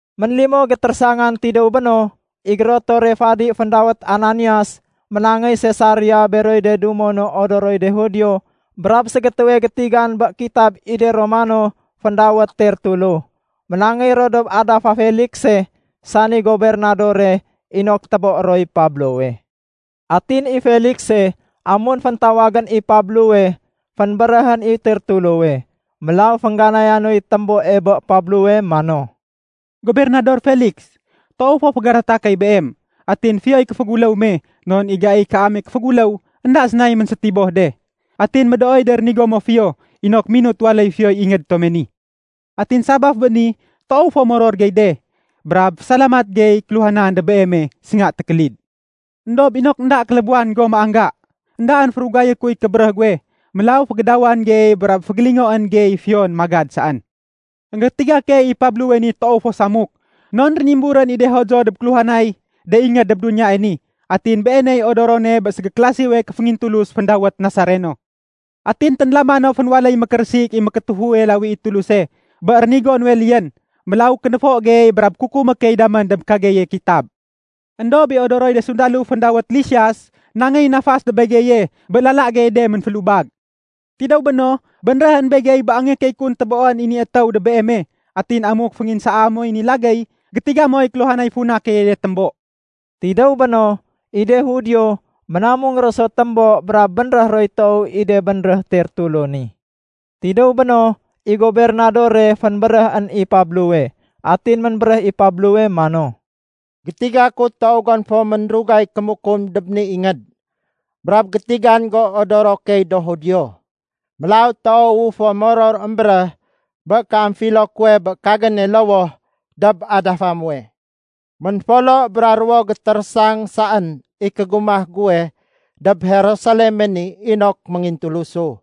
Ménlimo gétérésangan tidéw béno, i gérotore fadi féndawét Ananias ménangéy Sesaria beroy de dumo no odoroy de Judio brab ségétéwe gétigan bé kitab i de Romano féndawét Tertulo. Ménangéy ro dob adafa Felikse, sani gobernadore, inok téboé roy Pablowe. Atin i Felikse, amun féntawagén i Pablowe, fénbéréhén i Tertulowe. Mélaw féngganaya noy témboe bé Pablowe mano, “Gobernador Feliks, toow fo fégadata key beem. Atin fiyoy kéféguléw me non i gaiy kaame kéféguléw énda sénay ménsétiboh de. Atin médooy de rénigo mo fiyo inok minut waléy fiyoy ingéd tome ni. Atin sabaf bé ni, toow fo moror gey de brab fésalamat gey kéluhanan dob beeme sénga tékélid. Endob inok énda kélébuwan go méangga, éndaén férugayé kuy kébéréh guwe. Mélaw fégédawan gey brab fégélingoén gey fiyon magad saén. Enggétiga key i Pablowe ni toow fo samuk non rénimburén i de Judio dob kéluhanay de ingéd dob duniyae ni. Atin beeney odorone bé ségéklasiwe kéféngintulus féndawét Nasareno. Atin ténlama no fénwaléy mékérésik i mékétéfuwe lawi i Tuluse, bé rénigo nuwe liyén. Mélaw kénéfo gey brab kukumé key damén dob kageye kitab. Endob i odoroy de sundalo féndawét Lisias nangeyén nafas dob begeye bé lala geye de ménfélubag. Tidéw béno, bénréhén begey bé angéyé key kun téboén i ni étéw dob beeme. Atin amuk fénginsaa moy ni lagéy, gétiga moy kéluhanay funa keye de témbo.” Tidéw béno, i de Judio ménamung ro so témbo brab bénréh roy toow i de bénréh Tertulo ni. Tidéw béno, i gobernadore fénbéréhén i Pablowe. Atin ménbéréh i Pablowe mano, “Gétiga ku toow gon fo ménrugay kémukum dob ni ingéd brab gétigan go odoro key do Judio. Mélaw toowu fo moror émbéréh bé kéamfilo kuwe bé kagéne lowoh dob adafa muwe. Ménfolo bra ruwo gétérésang saén i kégumah guwe dob Jerusaleme ni inok méngintulusu.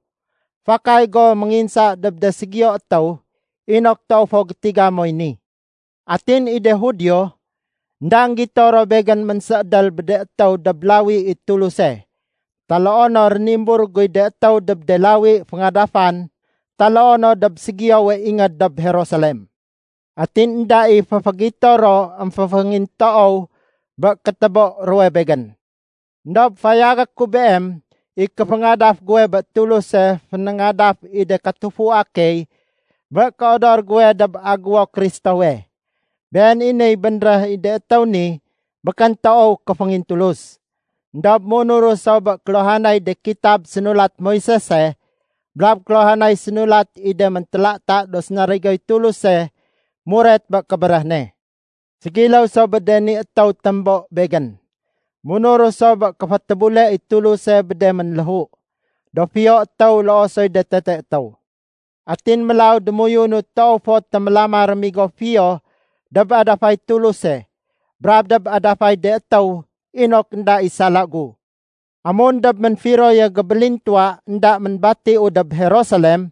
Fakay go ménginsa dob de ségiyo étéw inok toow fo gétiga moy ni. Atin i de Judio, énda énggito ro begén ménséédél bé de étéw dob lawi i Tuluse taloo no rénimbur guy de étéw dob de lawi féngadafan taloo no dob ségiyowe ingéd dob Jerusalem. Atin énda i féfégito ro émféféngintoow bé kétébo ruwe begén. Endob fayagé ku beem i kéféngadaf guwe bé Tuluse fénéngadaf i de katufua key bé kéodor guwe dob Agéwo Kristowe. Been i niy bénréh i de étéw ni békén toow kéféngintulus. Endob munuru so bé kéluhanay de kitab sénulat Moisese brab kéluhanay sénulat i de méntélata do sénarigoy Tuluse muret bé kébéréh ne. Ségiléw so bé de ni étéw témbo begén, munuru so bé kéfétébule i Tuluse bé de ménléhu, do fiyo étéw loo soy de tete étéw. Atin mélaw démoyunu toow fo témélama rémigo fiyo dob adafay Tuluse brab dob adafay de étéw inok énda i sala gu. “Amun dob ménfiroye gébélintuwa énda ménbatiu dob Jerusalem,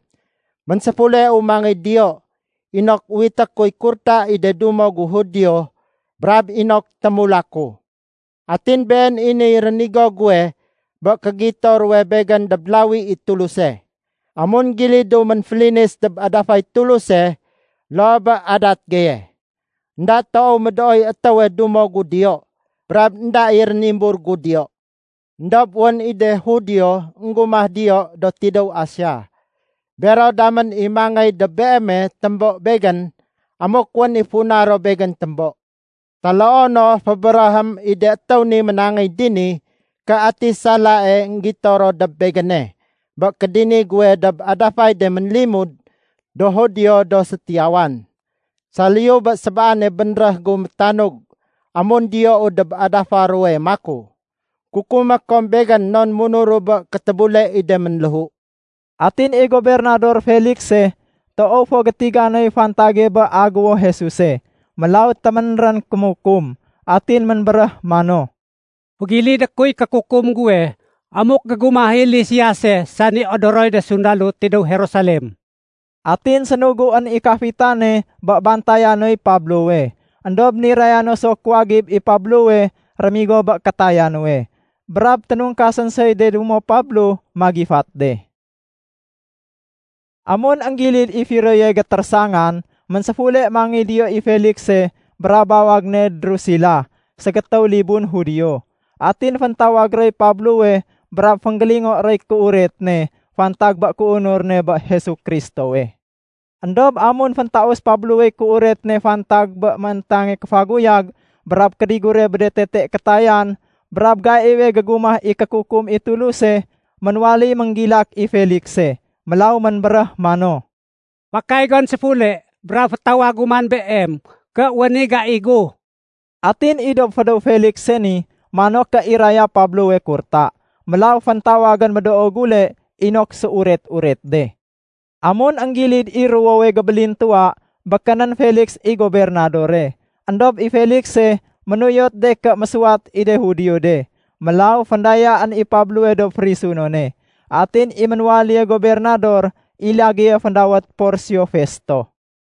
ménséfuleu mangéy diyo inok uwité kuy kurta i de dumo gu Judio brab inok témulaku. Atin been i niy rénigo guwe bé kégito ruwe begén dob lawi i Tuluse, amun gilidu ménfélinis dob adafay Tuluse loo bé adat geye. Enda toow médooy étéwe dumo gu diyo brab énda i rénimbur gu diyo. Endob wén i de Judio énggumah diyo do tidéw Asia. Bero damén i mangéy dob beeme témbo begén amuk wén i funa ro begén témbo. Taloo no fébéréhém i de étéw ni ménangéy dini ké ati salae énggito ro dob begéne bé kédini guwe dob adafay de ménlimud do Judio do sétiyawan, saliyu bé sébaane bénréh gu métanug amun diyou dob adafa ruwe maku, ‘Kukumé kom begén non munuru bé kétébule i de ménléhu.’” Atin i Gobernador Felikse, toow fo gétiga noy fantage bé Agéwo Jesuse, mélaw téménrén kémukum. Atin ménbéréh mano, “Fégilidé kuy kékukum guwe amuk gégumah i Lisiase sani odoroy de sundalo tidéw Jerusalem.” Atin sénuguén i kafitane bé bantaya noy Pablowe, éndob niraya no so kuwagib i Pablowe rémigo bé kétaya nuwe. Brab ténungkasén soy de dumo Pablo magifat de. Amun énggilid i firoye gétérésangan, ménséfule mangéy diyo i Felikse brab bawag ne Drusila ségétéw libun Judio. Atin féntawag roy Pablowe brab fénggélingo roy kéuret ne fantag bé kéunur ne bé Jesu Kristowe. Endob amun féntaus Pablowey kéuret ne fantag bé mééntange kéfaguyag brab kédigure bé de tete kétayan brab gaiwe gégumah i kékukum i Tuluse, ménwaléy ménggilak i Felikse. Mélaw ménbéréh mano, “Fakay gon séfule brab fétawagu man beem ké wén i gai gu.” Atin i dob fédéw Felikse ni, mano ké iraya Pablowe kurta. Mélaw féntawagén médoo gule inok séuret-uret de. Amun énggilid i ruwowe gébélintuwa, békénén Feliks i gobernadore. Endob i Felikse ménuyot de ké mésuwat i de Judio de, mélaw féndayaén i Pablowe dob férisunone. Atin i ménwaléye gobernador i lagéye féndawét Porsio Festo.